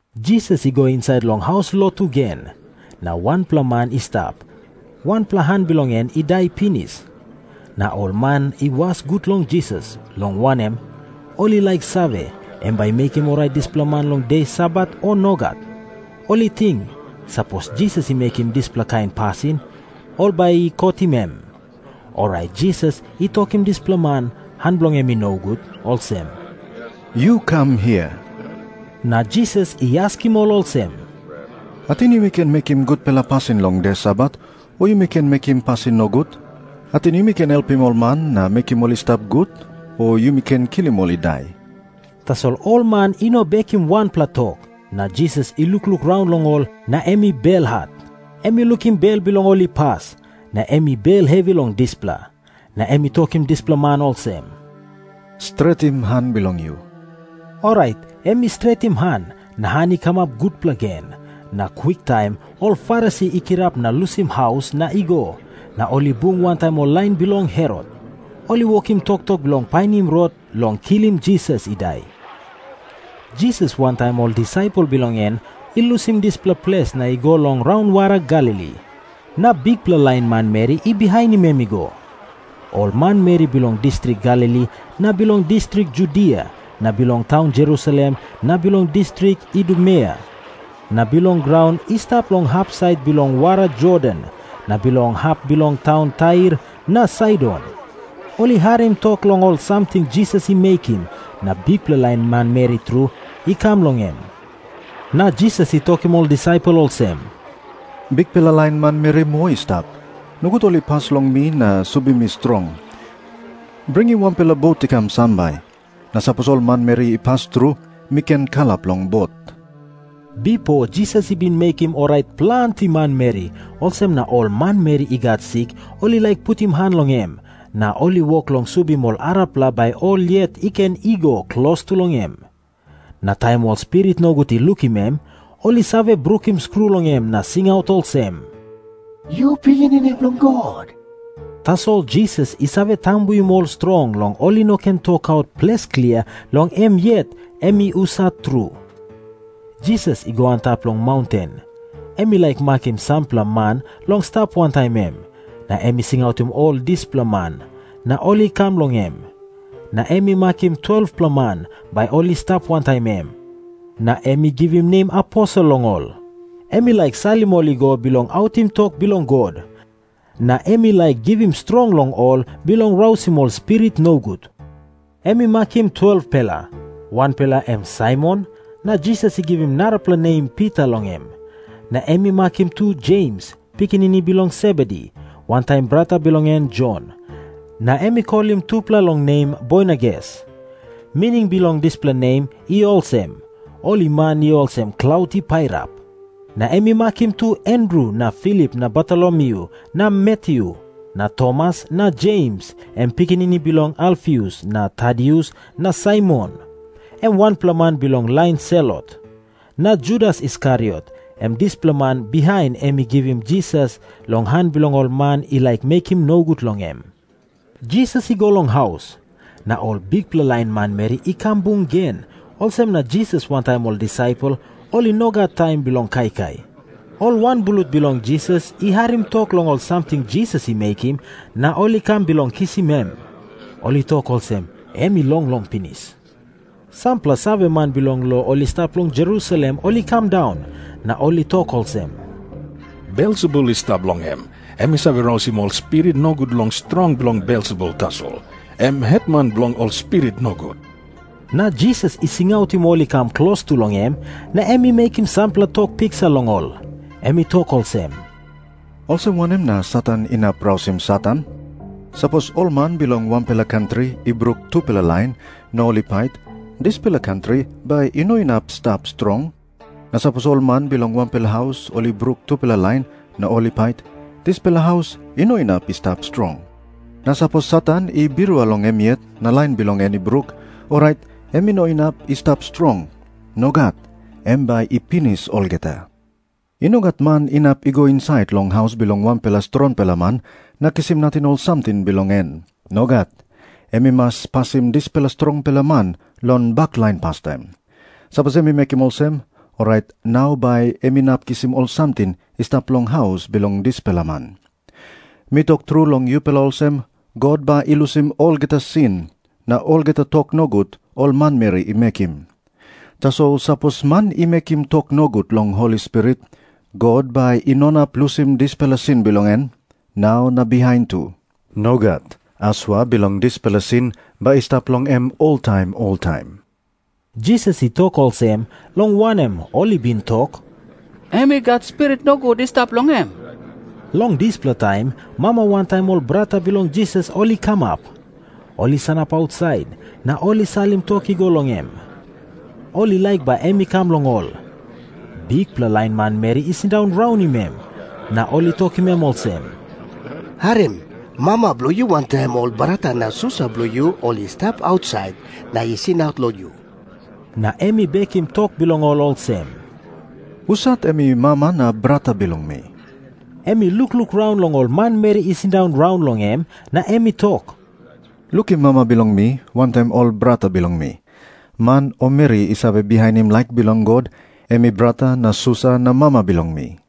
Jisas i go insait long haus lotu gen. Na wanpela man i stap, wanpela han bilong en i dai pinis. Na ol man i was gut long Jisas, long wanem, ol i laik save, em bai i mekim orait dispela man long de Sabat, o nogat. Ol i ting, sapos Jisas i mekim dispela kain pasin, ol bai i kotim em. Orait Jisas i tokim dispela man, han bilong en i nogut, olsem, “Yu kam hia.” Na Jisas i askim ol olsem, “Ating yumi ken mekim gutpela pasin long de Sabat, o yumi ken mekim pasin nogut? Ating yumi ken helpim ol man na mekim ol i stap gut, o yumi ken kilim ol i dai?” Tasol ol man i no bekim wanpela tok. Na Jisas i lukluk raun long ol, na em i belhat. Em i lukim bel bilong ol i pas, na em i bel hevi long dispela. Na em i tokim dispela man olsem, “Stretim han bilong yu.” Orait em i stretim han, na han i kamap gutpela gen. Na kwiktaim ol Farisi i kirap na lusim haus na i go, na ol i bung wantaim lain bilong Herot. Ol i wokim toktok bilong painim rot long kilim Jisas i dai. Jisas wantaim ol disaipel bilong en i lusim dispela ples na ol i go long raunwara Galili. Na bikpela lain manmeri i bihainim em i go. Ol manmeri bilong distrik Galili na bilong distrik Judia na bilong taun Jerusalem na bilong distrik Idumea na bilong graun i stap long hapsait bilong wara Jordan na bilong hap bilong taun Tair na Saidon, ol i harim tok long ol samting Jisas i mekim, na bikpela lain manmeri tru i kam long em. Na Jisas i tokim ol disaipel olsem, “Bikpela lain manmeri moa i stap. Nogut ol i pas long mi na subim mi strong. Bringim wanpela bot i kam sambai, na sapos ol manmeri i pas tru, mi ken kalap long bot.” Bipo Jisas i bin mekim orait planti manmeri, olsem na ol manmeri i gat sik ol i laik putim han long em, na ol i wok long subim ol arapela bai ol yet i ken i go klostu long em. Na taim ol spirit nogut i lukim em, ol i save brukim skru long em na singaut olsem, “Yu Pikinini Bilong God.” Tasol Jisas i save tambuim ol strong long ol i no ken tokaut ples klia long em yet em i husat tru. Jisas i go antap long maunten. Em i laik makim sampela man long stap wantaim em. Na em i singautim ol dispela man, na ol i kam long em. Na em i makim 12-pela man, bai ol i stap wantaim em, na em i givim nem aposel long ol. Em i laik salim ol i go bilong autim tok bilong God, na em i laik givim strong long ol bilong rausim ol spirit nogut. Em i makim 12-pela. Wanpela em Saimon, na Jisas i givim narapela nem Pita long em. Na em i makim tu Jems, pikinini bilong Sebedi, wantaim brata bilong en Jon. Na em i kolim tupela long nem Boanerges. Mining bilong dispela nem i olsem, “Ol man i olsem klaut i pairap.” Na em i makim tu Andru na Filip na Bartolomyu na Matyu na Tomas na Jems, em pikinini bilong Alfius, na Tadius na Saimon, em wanpela man bilong lain Selot, na Judas Iskariot, em dispela man bihain em i givim Jisas long han bilong ol man i laik mekim nogut long em. Jisas i go long haus. Na ol bikpela lain manmeri i kam bung gen, olsem na Jisas wantaim ol disaipel ol i no gat taim bilong kaikai. Ol wanblut bilong Jisas i harim tok long ol samting Jisas i mekim, na ol i kam bilong kisim em. Ol i tok olsem, “Em i longlong pinis.” Sampela saveman bilong lo i stap long Jerusalem ol i kam daun, na ol i tok olsem, “Belsebul i stap long em. Em i save rausim ol spirit nogut long strong bilong Belsebul tasol, em hetman bilong ol spirit nogut.” Na Jisas i singautim ol i kam klostu long em, na em i mekim sampela tok piksa long ol. Em i tok olsem, “Olsem wanem na Satan inap rausim Satan? Sapos ol man bilong wanpela kantri i bruk tupela lain na ol i pait, dispela kantri bai i no inap i stap strong. Na sapos ol man bilong wanpela haus ol i bruk tupela lain na ol i pait, dispela haus i no inap i stap strong. Na sapos Satan i birua long em yet na lain bilong en i bruk, orait em i no inap i stap strong. Nogat. Em bai i pinis olgeta. “I no gat man inap i go insait long haus bilong wanpela strongpela man na kisim nating ol samting bilong en. Nogat. Em i mas pasim dispela strongpela man long baklain pastaim. Sapos em i mekim olsem, orait nau bai em inap kisim ol samting i stap long haus bilong dispela man. “Mi tok tru long yupela olsem, God bai i lusim olgeta sin na olgeta tok nogut ol manmeri i mekim. Tasol sapos man i mekim tok nogut long Holi Spirit, God bai i no inap lusim dispela sin bilong en, nau na bihain tu. Nogat. Asua bilong dispela sin bai i stap long em oltaim oltaim.” Jisas i tok olsem, long wanem, ol i bin tok, “Em i gat spirit nogut i stap long em.” Long dispela taim mama wantaim ol brata bilong Jisas ol i kamap. Ol i sanap ausait, na ol i salim tok i go long em. Ol i laik bai em i kam long ol. Bikpela lain manmeri i sindaun raunim em, na ol i tokim em olsem, “Harim. Mama bilong yu wantaim ol brata na susa bilong yu ol i stap ausait na i singaut long yu.” Na em i bekim tok bilong ol olsem, “Husat em i mama na brata bilong mi?” Em i lukluk raun long ol manmeri i sindaun raun long em, na em i tok, “Lukim mama bilong mi wantaim ol brata bilong mi. Man o meri i save bihainim laik bilong God, em i brata na susa na mama bilong mi.”